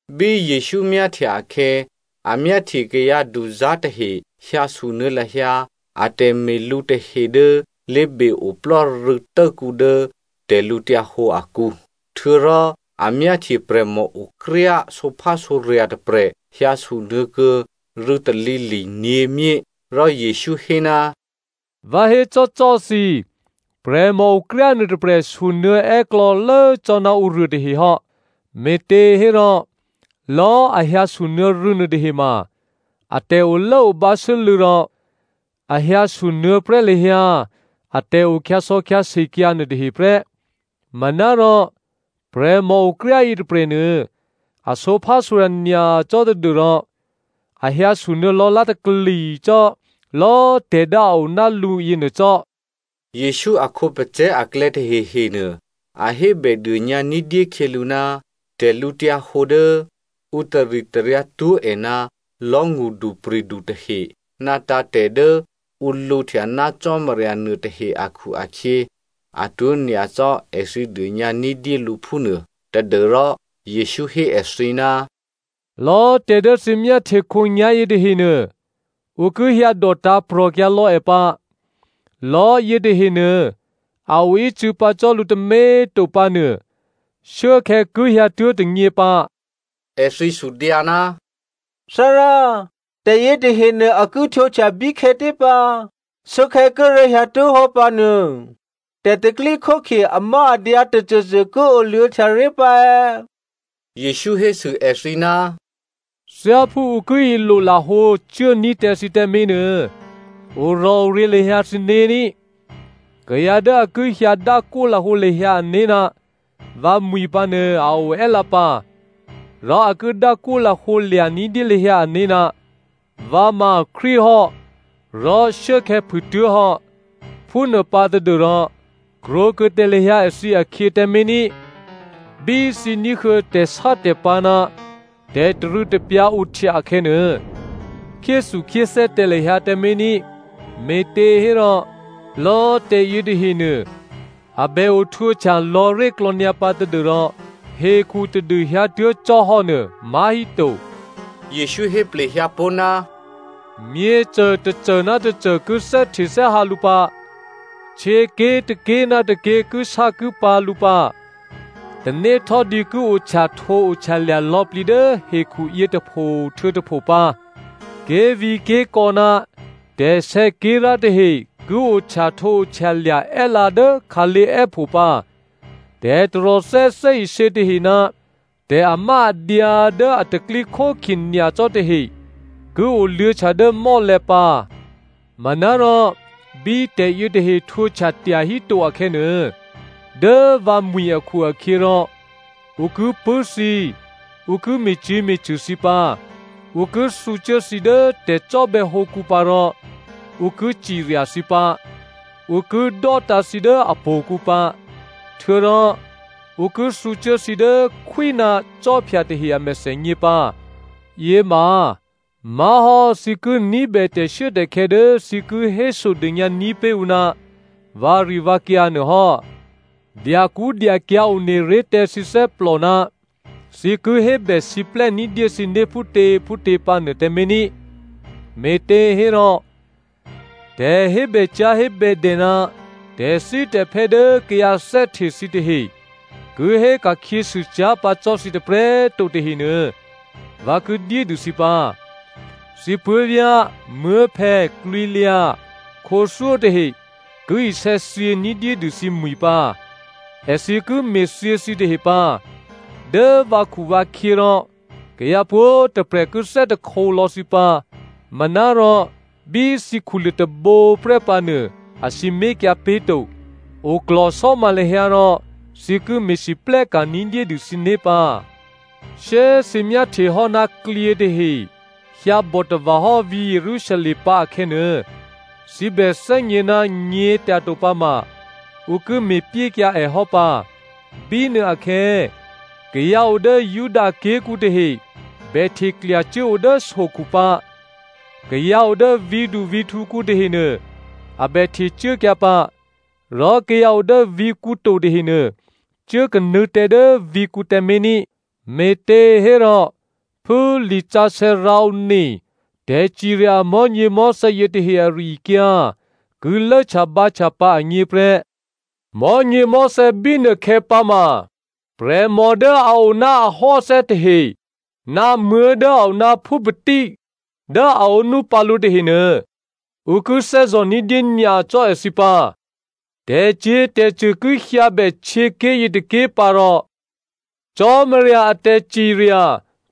Bí Jesǔ myáhtya akhè̌, a myáhtye kayǎduzá̤ tahe hyǎ sunuô̌ lahyǎ a tè̤me̤lǔ tahe dố lé̤be-oplò́ rû̌tốkǔ dố tè̤lǔhǒdu akǔ. Htuô̌rò a myáhtye prè̤mòokryá sǒphásǒrya̤ tôprè̤ hyǎ sunuô̌ kuô̌ rû̌ talǐli̤ nyě̤myé. Rò Jesǔ hé, “Vǎ hécò́cò́꤮ thǐ, prè̤mòokryá nuôtôprè̤ sunuô̌ è́klò̌lố cò́ ná ǔruô tahehò́. Me̤těhérò lò̌꤮ a hyǎsunuô̌ rû̌ nuôtahema, a tè̤olốobǎ sû́lû̌ rò a hyǎsunuô̌ prè́ lahyǎ atè̤ o kyǎsò̌kyǎse kyǎ nuôtahe prè́. Manárò prè̤mòokryá yětôprè̤nuô a sǒphásǒrya̤ nyacò́ tadû́rò a hyǎsunuô̌ lò̌lá̤takli cò́ lò̌꤮ tè̤ dố a o ná lǔ yěnuô cò́.” Jesǔ a khǒpacè̤̌ aklè̌ tahehenuô, a hébèdônyǎ ní̤dyé khyělǔ ná tè̤lǔhǒdu dố ǔ taritaryǎ twó̤ è ná lò̤́ ngṳdupri̤du tahe ná tǎ̤tè̤ dố ǔ lǔhtya ná Cò́marya nuôtahe akhu-akhyě atwó̤ nyacò́꤮ èthǐ dônyǎ ní̤dyé lǔ phúnuô tadû́rò Jesǔ hé èthǐ, “Lò̌꤮ tè̤ dố thǐ myáhtye khǒnyá̤yě tahenuô, ǔ ki hyǎdò tǎ̤prò̤kyǎ lò̌ è pǎ. Lò̤́ yětahenuô a oícû̌ pǎ cò́ lǔ tômě꤮ to pǎnuô, shuốkhè̌ ki hyǎtuố̤ tônyě pǎ.” Èthǐ sudyǎ, “Thárá, tè̤ yětahenuô a ki htwǒhtya bíkhè̌tě pǎ? Shuốkhè̌ kíré̤ hyǎtuố̤hò́ pǎ nuô tè̤pro̤tè̤prya̤ amáadyǎ tôcôcô ki oluô̌htyaré̤ pǎ è̌?” Jesǔ hésû èthǐ, “Thyáphú ǔ ki ilolahǒ cuốní̤ tǎ thǐ tǎmé̤nuô, orò̤oryě̤ lahyǎ thǐné̤ ní꤮. Kayǎ dố a ki hyǎ dákwó lahǒ lahyǎ ané̤ ná vǎmwi̤ pǎnuô a o è́lǎ pǎ, rò a ki dákwó lahǒ lya̤ ní̤dyé lahyǎ ané̤, ‘Vǎ ma Krístu hò́,’ rò ‘Shuốkhè̌ phûtuố̤ hò́,’ phúnuô pǎ tadû́rò krwǒkuô̌ tǎ lahyǎ èthǐ akhyě tǎmé̤ ní꤮. Bí thǐ ní̤huô̌ tè̤sátè̤pǎ̤ ná tè̤tarû̌tapyǎ ohtya akhè̌nuô, khyéthukhyéthè́ tǎ lahyǎ tǎmé̤ ní꤮. Me̤těhérò lò̌꤮ tè̤ yětahenuô, a bè ohtwǒhtya lò̌ré̤klò̌ nyǎpǎ tadû́rò hekhu tadû hyǎtuố̤ cò́ hò́nuô má̤híto.” Jesǔ hé plehyǎ pó̤, “Myěcô tôcô ná tôcô ki thè́htethè́hǎ lǔ pǎ. Htyěké̤ tôké̤ ná tôké̤ kisákipǎ̤ lǔ pǎ. Tanéhtò́dǐ ki ohtyahtǒohtyalya̤ lò̌plǐ dố hekhuyě tôpho htuô̌ tôpho pǎ. Ké̤vǐ̤ké̤kò̌ ná tè̤sè̌ké̤rá̤ tahe ki ohtyahtǒohtyalya̤ è́lǎ dố khǎlé̤ è́pho pǎ. Tè̤taròthè́ thè́isě tahe ná tè̤amáadyǎ dố a tè̤pro̤tè̤prya̤ nyacò́ tahe ki oluô̌htya dố mò́lè̤̌ pǎ. “Manárò bí tè̤yětahe htwǒhtya tyahíto akhè̌nuô, dố vǎmwi̤ akhu-akhyěrò ǔ ki pṳ̂́ thǐ ǔ ki me̤cyě̤me̤cṳ̂ thǐ pǎ, ǔ ki thǔcuố thǐ dố tè̤cò́bè̌hǒkǔ pǎ rò ǔ ki cirya thǐ pǎ, ǔ ki dò́tǎ̤ thǐ dố htò̌kǔ pǎ. Htuô̌rò ǔ ki thǔcuố thǐ dố khwí ná cò́phya tahe a mèthènyě pǎ. Yěma má̤hò́ thǐ ki ní̤bè tè̤shuốtè̤khè̌ dố thǐ ki hésodônyǎní̤ pé̤ ǔ ná vǎrivǎkyǎ nuô hò́. Dyakṳ́dyakyǎ̤ one ré̤ tǎ thǐ thè́plò ná thǐ ki hébèsiplè́ ní̤dyé thǐné̤ phútěphútě pǎ nuô tǎmé̤ ní꤮. Me̤těhérò, tè̤hébècyá̤hébèdè ná tè̤thítè̤phè́ dố kayǎ thè́hte thǐtahe ki hé ka̤khyěsû cyá̤ pǎ cò́ thǐ tôprè̤꤮ to tahenuô, vǎ ki dyédû thǐ pǎ. Thǐ puố̤vyá̤, muố̤phè̌, klwǐlyǎ, khǒthyó tahe ki isè̌thyě ní̤dyédû thǐmwi̤ pǎ. Èthǐ ki me̤thyě thǐtahe pǎ. Dố vǎkhuvǎkhyě rò kayǎ pwǒ̤꤮ tôprè̤ ki thè́hte lò̌ thǐ pǎ. Manárò bí thǐ khuluô̤ tôbǒ prè́ pǎnuô, a sǐmé̤kyǎ pé̤ to. Oklò̤sò́ma lahyǎ rò thǐ ki me̤lwóhteka̤ ní̤dyédû thǐné̤ pǎ. “Shyé꤮ thǐ myáhtyehò́ ná klyě tahe hyǎbòtava̤ hò́ vǐ̤ Jerusalem pǎ akhè̌nuô, thǐ bè thè́gně ná nyě̤tyato pǎ ma, ǔ ki me̤pyékyǎ è hò́ pǎ. Bínuôakhè̌, kayǎ o dố Judaké̤kǔ tahe bè hteklyacuố o dố sokhu pǎ. Kayǎ o dố vǐ̤duvǐ̤htǔkǔ tahenuô, a bè htecuốkyǎ pǎ, rò kayǎ o dố vǐ̤kǔ to tahenuô cuốkanuô̌ tǎ dố vǐ̤kǔ tǎmé̤ ní. Me̤těhérò, phú lisǎsè̌ rǎone tè̤cirya amò̤́nyěmò̤́thè̌ yětahe ari-akyǎ ki lốhtyabǎhtya pǎ agně prè́. Mò̤́nyěmò̤́thè̌ bínuôkhè̌ pǎ ma, prè̤mò dố a o ná ahò́athè́ tahe ná muố̤ dố a o ná phúpatí dố a ǒnú pǎ lǔ tahenuô, ǔ ki thè́zò̤ ní̤dyé nyacò́ èthǐ pǎ. Tè̤cyě̤tè̤cṳ̂ ki hyǎ bè htyěké̤ yětôké̤ pǎ rò Cò́marya a tè̤cirya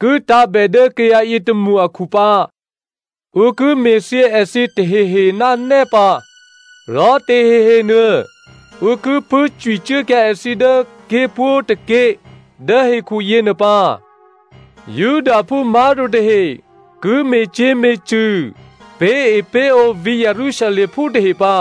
ki tǎ̤bè dố kayǎ yětômṳ akhu pǎ. Ǔ ki me̤thyě èthǐ tahehe ná nè́ pǎ, rò tahehenuô, ǔ ki pṳ̂́cwicuốkyǎ èthǐ dố ké̤pwǒ̤tôké̤ dố hekhu yěnuô pǎ. Judaphú má̤to tahe ki me̤cyě̤me̤cṳ̂ pé̤epé̤ǒ vǐ̤ Jerusalemphú tahe pǎ,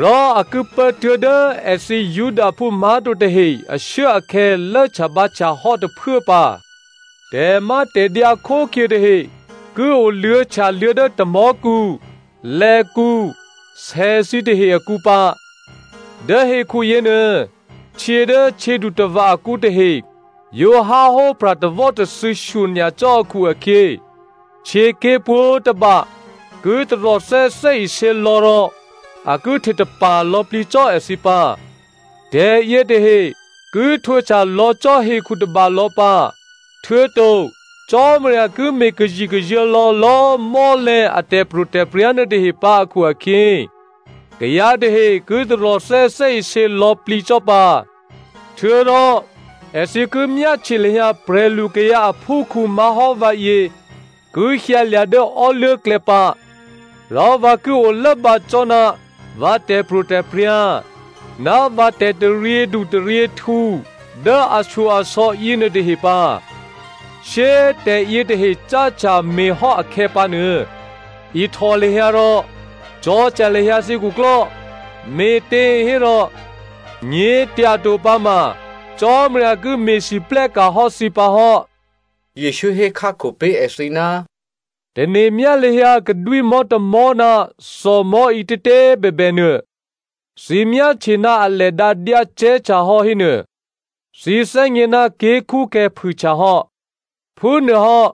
rò a ki pố tuố̤dố èthǐ Judaphú má̤to tahe ashuốakhè̌ lốhtyabǎhtya hò́ tôphuố pǎ. “Tè̤mátè̤dyǎ khókhye tahe ki oluô̌htyaluô̌ dố tamò̤́kǔ, lè̌kǔ, sè thǐtahe akǔ pǎ. Dố hekhu yěnuô, htyě dố htyědutava̤ akǔ tahe yǒ háhó pra̤ tawò́tathû̌ shyonyacò́ akhu-akhyě, htyěké̤ pwǒ̤tôba ki taròthè́ thè́isě lò̌ rò a ki htetapa̤ lò̌plǐ cò́ èthǐ pǎ. Tè̤yětahe ki htwǒhtya lò̌ cò́ hekhu tôbalò̌ pǎ, htuô̌to Cò́marya ki me̤kazikazuô̤̌ lò̌lò̌꤮ mò́lè̤̌ a tè̤pro̤tè̤prya̤ nuôtahe pǎ akhu-akhyě kayǎ tahe ki taròthè́ thè́isě lò̌plǐ cò́ pǎ. Htuô̌rò èthǐ ki myáhtye lahyǎ prè̤lukayǎ aphúkhǔ má̤hò́ vǎyě ki hyǎlya̤ dố ò́luố̤klè̌ pǎ, rò vǎ ki olốbǎ cò́ ná vǎ tè̤pro̤tè̤prya̤ ná vǎ tè̤taryědu taryěhtǔ dố ashyo-asò̌ yěnuôtahe pǎ. Shyé꤮ tè̤yětahe cáhtya me̤hò́ akhè̌pǎnuô, ihtò lahyǎ rò cò̤̌htya lahyǎ thǐ khuklò́, me̤těhérò, nyě̤tyato pǎma Cò́marya ki me̤lwóhteka̤ hò́ thǐ pǎ hò́.” Jesǔ hékhákho pé̤ èthǐ, “Tane̤myá lahyǎ kadwímò̤́ tômò̤́ ná thòmò̤́ ǐtětě꤮ bèbè nuô. Thǐ myáhtye ná alè dǎ dyácè̤́htyahò́ hénuô, thǐ thè́gně ná ké̤kṳ́khè̌ phûhyǎ hò́. Phúnuôhò́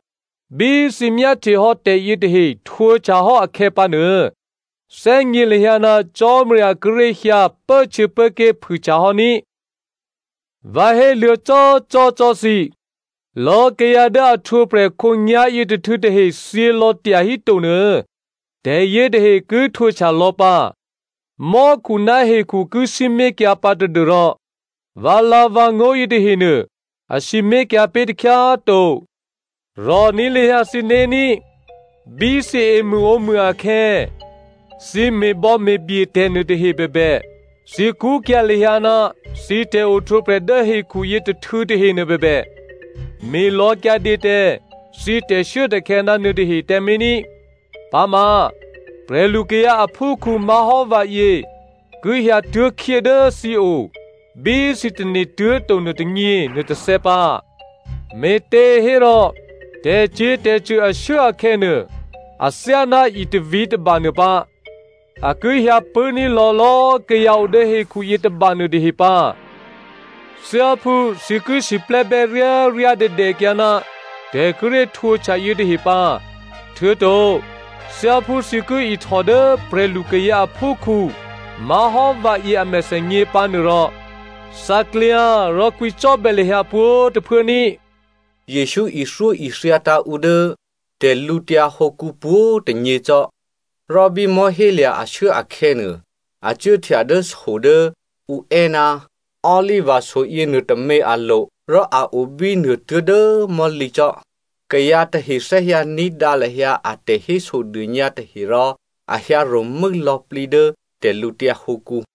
bí thǐ myáhtyehò́ tè̤yě tahe htwǒhtyahò́ akhè̌pǎnuô, thè́gně lahyǎ ná Cò́marya kíré̤ hyǎ pốhtyěpốké̤ phûhtya hò́ ní꤮. “Vǎ héluô̌cò́cò́꤮ cò́ thǐ, lò̌꤮ kayǎ dố a ohtwǒprè̤ khǒnyá̤yětôhtû̌ tahe thyělò̌ tyahíto nuô, tè̤yětahe ki htwǒhtya lò̌ pǎ. Mò́khu ná hekhu ki sǐmé̤kyǎ pǎ tadû́rò vǎlǎ̤vǎngó̤ yětahenuô a sǐmé̤kyǎ pé̤ takhyá꤮ to. “Rò̤ní̤ lahyǎ thǐné̤ ní. Bí thǐ emṳ̂ǒmṳ̂ akhè̌ thǐ me̤bò̌me̤bye tè̤ nuôtahe bèbè, thǐ kṳ́kyǎ̤ lahyǎ ná thǐ tè̤ohtwǒprè̤ dố hekhuyě tôhtû̌ tahenuô bèbè, me̤lò̌kyǎdě tǎ thǐ tè̤shuốtè̤khè̌ ná nuôtahe tǎmé̤ ní. Pǎma prè̤lukayǎ aphúkhǔ má̤hò́ vǎyě ki hyǎtuố̤khyé dố thǐ o bí thǐ tane̤tuố̤ to nuôtônyě nuôtôthè̌ pǎ. Me̤těhérò tè̤cyě̤tè̤cṳ̂ ashuốakhè̌nuô athyáná itavǐ tôbanuô pǎ, a ki hyǎpṳ̂́ní̤ lò̌lò̌꤮ kayǎ o dố hekhu yětôba nuôtahe pǎ. Thyáphú thǐ ki siplè́bè́ ryáryádèdè kyǎ ná tè̤ kíré̤ htwǒhtya yětahe pǎ, htuô̌to thyáphú thǐ ki ihtò dố prè̤lukayǎ aphúkhǔ má̤hò́ vǎyě a mèthènyě pǎ nuôrò, thǎklyǎ rò kwǐcò́bè̌ lahyǎ pwǒ̤꤮ tôphuố ní꤮.” Jesǔ ithyóithya tǎ̤ ǔ dố tè̤lǔtyǎ hǒkǔ pwǒ̤꤮ tônyě cò́. Rò bí mò̤́hélya̤ ashuốakhè̌nuô, a cuốhtya dố so dố ǔ è́ ná Oliva so yěnuôtômě alo̤, rò a o bínuô tuố̤dố mò̤́lǐ cò́. Kayǎ tahe thè́hyǎ ní̤dǎ lahyǎ a tè̤hésodônyǎ tahe rò a hyǎ ro̤mû́ lò̌plǐ dố tè̤lǔtyǎ hǒkǔ.